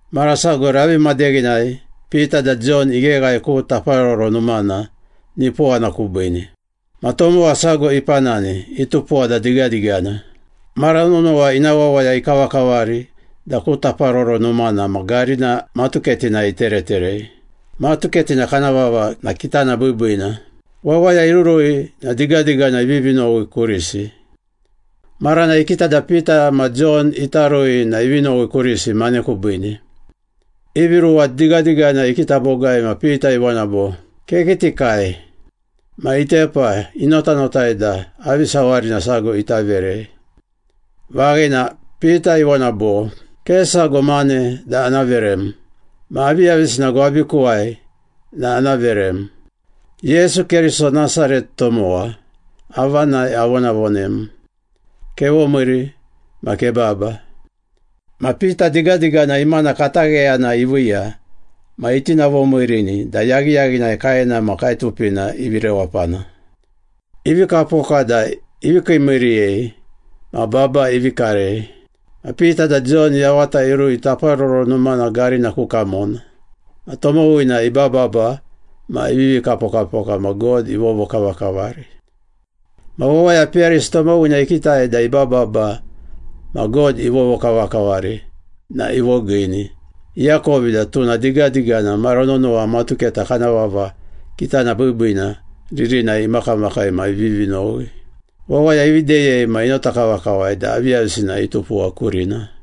Mara sago ravi madeghinai Pita da Jon igheghae ku Taparoro Numana, nipowana kubiine. Ma tomowa sago ipanani, itupuwa da digadigana. Mara nonowa ina wawaya ikavakavari da ku Taparoro Numana ma garina matuketinai itereterei. Matuketina kana vava na ‘Kitana Biibiina.’ Wawaya irurui na digadigana ivivi nowi kurisi. Maranai ikita da Pita ma Jon ita rui na ivi nowi kurisi mane kubiine. Ivi ruwa digadigana ikita bogai ma Pita ivona bo, “Kekitikai.” Ma itepa, inotanotai da avi sawarina sago ita verei. Vaghina, Pita ivona bo, “Ke sago mane da ana verem. Ma aviyavisina gwabikuwai na ana verem. Yesu Keriso, Nasaret tomowa, avanai avonavonem. Kevomiiri ma kebaba!” Ma Pita digadigana imana katagheyana iviiya, ma itinavovimiirini da yaghiyaghinai kaena ma kaetupina ivi rewapana. Ivi kapoka da ivi kiimiiriyei ma baba ivi karei. Ma Pita da Jon yavata irui Taparoro Numana garina ku kamona. Ma tomowina ibababa ma ivivi kapokapoka ma God ivovokavakavari. Ma wawaya peyarisi tomowina ikitai da ibababa ma God ivovokavakavari na ivogiini. Iakovi da tuna digadigana mara nonowa matuketa kana vava ‘Kitana Biibiina’ ririnai imakamakai ma ivivi nowi. Wawaya ivi deyei ma inota kavakavai da aviyavisina itupuwa kurina.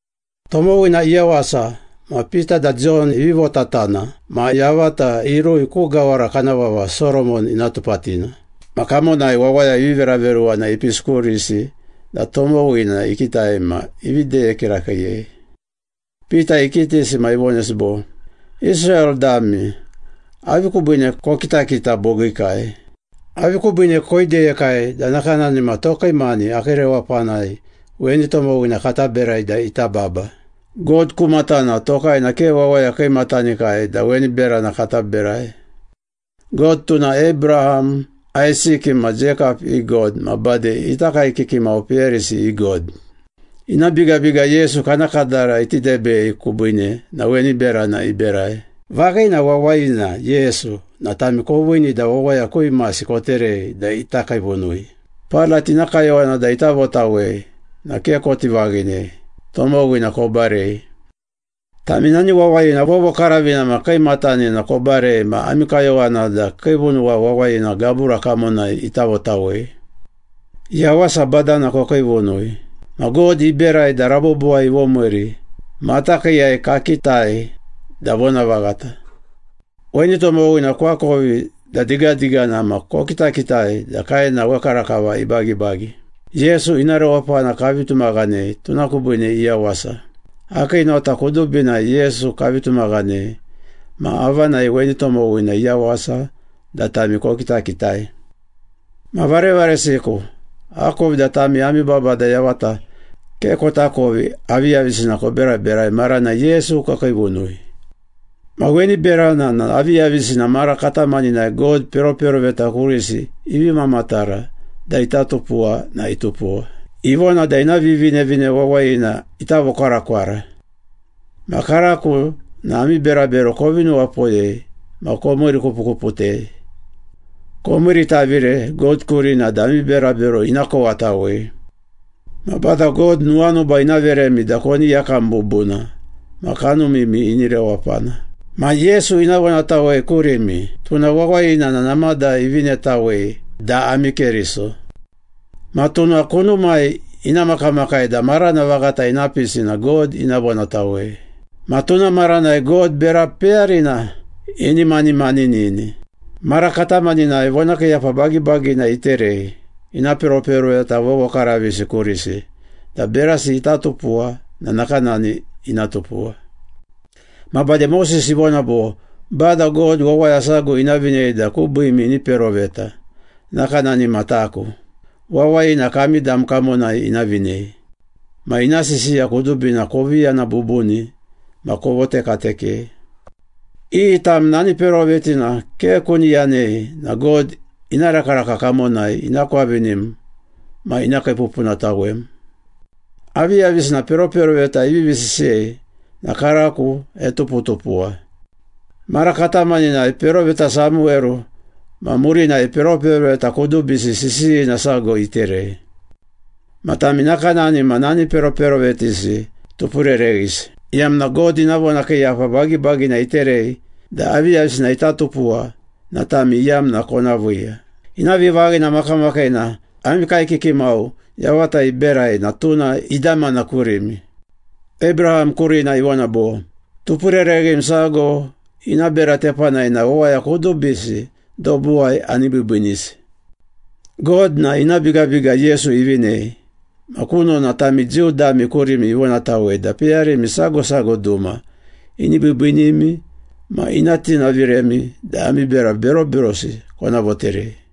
Tomowina iyawasa na Pita da Jon ivi votatana ma yavata irui ku gawara kana vava Soromon Ina Tupatina. Ma kamonai wawaya ivi veraveruwana ipisi kurisi da tomowina ikitai ma ivi deye kirakiiyei. Pita ikitisi ma ivonesi bo, “Israel dami, avi kubiine kokitakita bogiikai? Avi kubiine koideyekai da nakanani ma tokai mani akii rewapanai weni tomowina kata berai da ita baba. God ku matana tokai na ke wawaya kiimatanikai da weni berana kata berai. God, tuna Abraham, Aisiki ma Jeikap i God ma bade ita kaekiki mau peyarisi i God. Ina bigabiga Yesu kana kadara iti debei kubiine na weni berana iberai. Vaghina wawayina Yesu na tami koviini da wawaya ku imasi koterei da ita kiivunui. Pailat ina kayowana da ita votawei na ke koti vaghinei, tomowina kobarei. Tami nani wawayina vovokaravina ma kiimatanina kobarei ma ami kayowana da kiivunuwa wawayina gabura kamonai ita votawei. Yawasa Badana kokiivunui. Ma God iberai da rabobowai ivomiiri, matakiiyai kakitai da vonavaghata.” “Weni tomowina koakovi da digadigana ma kokitakitai da kaena wekarakava ibagibagi. Yesu ina rewapana kavi tumaghanei, tuna kubiine iyawasa. Akii nota kudubinai Yesu kavi tumaghanei ma avanai weni tomowina iyawasa da tami kokitakitai.” “Ma varevaresiku, akovi da tami ami babada yavata ke kotakovi aviyavisina koberaberai maranai Yesu kokiivunui. Ma weni beranai na aviyavisina mara katamaninai God peroperoveta kurisi ivi mamatara da ita tupuwa na itupuwa. Ivona da ina Vivinevine Wawayina ita vokwarakwara. Ma karako na ami berabero kovi nuwapoyei ma komiirikupukuputei. Komiiritavire God kurina da ami berabero ina kowatawei. Ma Bada God nuwanuba ina veremi da koni yakam bubuna ma kanumimi ini rewapana. Ma Yesu ina vonatawei kurimi, tuna wawayina na namada ivinetawei da ami Keriso. Ma tuna kunumai ina makamakai da marana vaghata ina pisi na God ina vonatawei. Ma tuna maranai God bera peyarina ini manimanini. Mara katamaninai vonakiiyapa bagibagina iterei ina peroperoveta vovokaravisi kurisi da berasi ita tupuwa na nakanani ina tupuwa. Ma bade Moses ivona bo, ‘Bada God wawaya sago ina vinei da kubiimi ini peroveta, nakanani ma taku. Wawayina kami dam kamonai ina vinei. Ma ina sisiya kudubina kovi yana bubuni ma kovotekatekei. Iyi tam nani perovetina ke kuni yanei na God ina rakaraka kamonai ina kwavinim ma ina kiipupunatawem.’ Aviyavisina peroperoveta ivivi sisiyei na karako etuputupuwa. Mara katamaninai peroveta Samuweru ma murinai peroperoveta kudubisi sisiyina sago iterei. Ma tami nakanani ma nani peroperovetisi tupurereghisi, iyamna God ina vonakiiyapa bagibagina iterei da aviyavisina ita tupuwa na tami iyamna kona viiya.” “Ina vivaghina makamakiina ami kaekiki mau yavata iberai na tuna idamana kurimi. Abraham kurina ivona bo, ‘Tupurereghim sago ina bera tepanai na wawaya kudubisi dobuwai ani biibiinisi.’ God na ina bigabiga Yesu ivinei ma kunona tami Jiu dami kurimi ivonatawei da peyarimi sago sago duma ini biibiinimi ma ina tinaviremi da ami bera beroberosi kona voterei.”